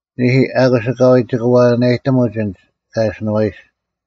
ᓂᐦᐃ, ᐊᑯᔅ ᐊᑲᐎᔾ ᒋᑭ ᐛᐛᓇᔨᑎᒧᒡ ᐊᓐᒡ ᑲ ᐊᓯᓄᐛᐃᔅᒡ: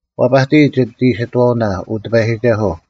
ᐛᐸᑎᔾ ᒋᑦ ᐃᓯᑥᐅᓇ, ᐅ ᑎᐸᔨᒋᒐᓱᐤ;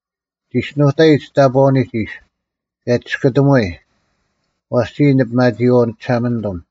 ᒋᔅᒋᓄᑕᐃᔾ ᒋᑕᑈᐅᓂᒡ ᐃᔅ, ᑭᔭ ᒋᔅᑯᑎᒧᐎᔾ: ᐛᔅ ᒋᔾ ᓂ ᐱᒪᒋᐃᐛᐤ ᓂᒋᓴᒪᓂᑐᒻ;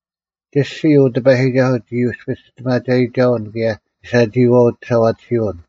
ᒋᔅᒋᓯ, ᐅ ᑎᐸᔨᒋᒐᓱᐤ, ᒋ ᔪᔅᐱ ᒋᔅᑎᒪᒐᔨᒐᐅᓐ ᑭᔭ ᒋ ᓴᒋᐃᐛᐤ ᒋᓴᐛᑎᓯᐅᓐ;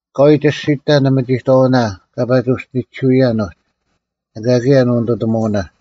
ᐊᑲᐎᔾ ᒋᔅᒋᑕ ᓂᒥᒋᑥᐅᓇ ᑲ ᐸᒋ ᐅᔅᒋᓂᒋᓱᐅᔭᓐ ᐅᒡ, ᐊᑲ ᑭᔭ ᓂᐅᓂᑐᑎᒧᐅᓇ: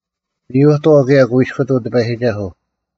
ᒥᔪᑥᐤ ᑭᔭ ᑯᐃᔅᑯᑐᐤ ᑎᐸᔨᒋᒐᓱᐤ: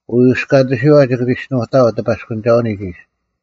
ᐅᔪᔅᑲᑎᓯᐛ ᒋᑭ ᒋᔅᒋᓄᑕᐊᐤ ᑎᐸᔅᑯᓂᒐᐅᓂᒡ ᐃᔅ: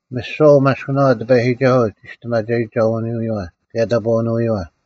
ᒥᓯᐛ ᐅᒪᔅᑭᓄᐛ ᑎᐸᔨᒋᒐᓱᐤ ᒋᔅᑎᒪᒐᔨᒐᐅᓄᐎᔪᐛ ᑭᔭ ᑕᑈᐅᓄᐎᔪᐛ,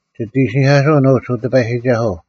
ᒋᑦ ᐃᓯᓂᐧᑲᓱᐅᓐ ᐅᒡ, ᐅ ᑎᐸᔨᒋᒐᓱᐤ,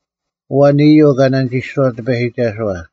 ᐊᐛᓐ ᐃᔪᐤ ᑲ ᓇᓂᒋᔅᑐᐛᑦ ᑎᐸᔨᒋᒐᓱᐛ?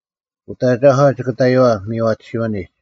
ᐅᑦ ᐊᒐᒂ ᒋᑭ ᑕᔪᐛ ᒥᔽᑎᓯᐅᓂᒡ;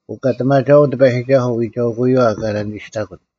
ᐅᑲᑎᒪᒐᐅᓐ ᑎᐸᔨᒋᒐᓱᐤ ᐎᒐᐎᑯᔪᐛ ᑲ ᓇᓂᒋᔅᑕᑯᑦ;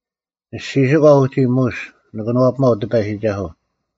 ᓂᔅᒋᓯᒂ ᐅᒋ ᒧᔅ ᓂ ᑭᓄᐛᐱᒪᐤ ᑎᐸᔨᒋᒐᓱᐤ;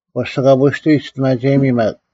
ᒂᔅᒋᑲᐳᔅᑐᐎ, ᒋᔅᑎᒪᒐᔨᒥ ᒪᒃ: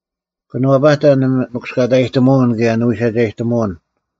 ᑭᓄᐛᐸᑕ ᓂᒥᑯᔅᑲᑕᔨᑎᒧᐅᓐ ᑭᔭ ᓂᐎᓯᒐᔨᑎᒧᐅᓐ;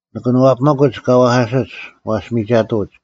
ᓇᑭᑐᐛᐱᒥᒡ ᑲ ᐛᐧᑲᓯᒡ; ᐛᔅ ᒥᒐᑐᐅᒡ;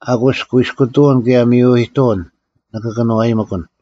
ᐊᑯᔅ ᑯᐃᔅᑯᑐᐅᓐ ᑭᔭ ᒥᔪᐃᑐᐅᓐ ᓂᑭ ᑭᓄᐛᔨᒥᑯᓐ;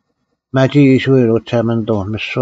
ᐱᒪᒋ ᐃᔅᕋᐃᓪ, ᐅ ᒋᓴᒪᓂᑐᐤ,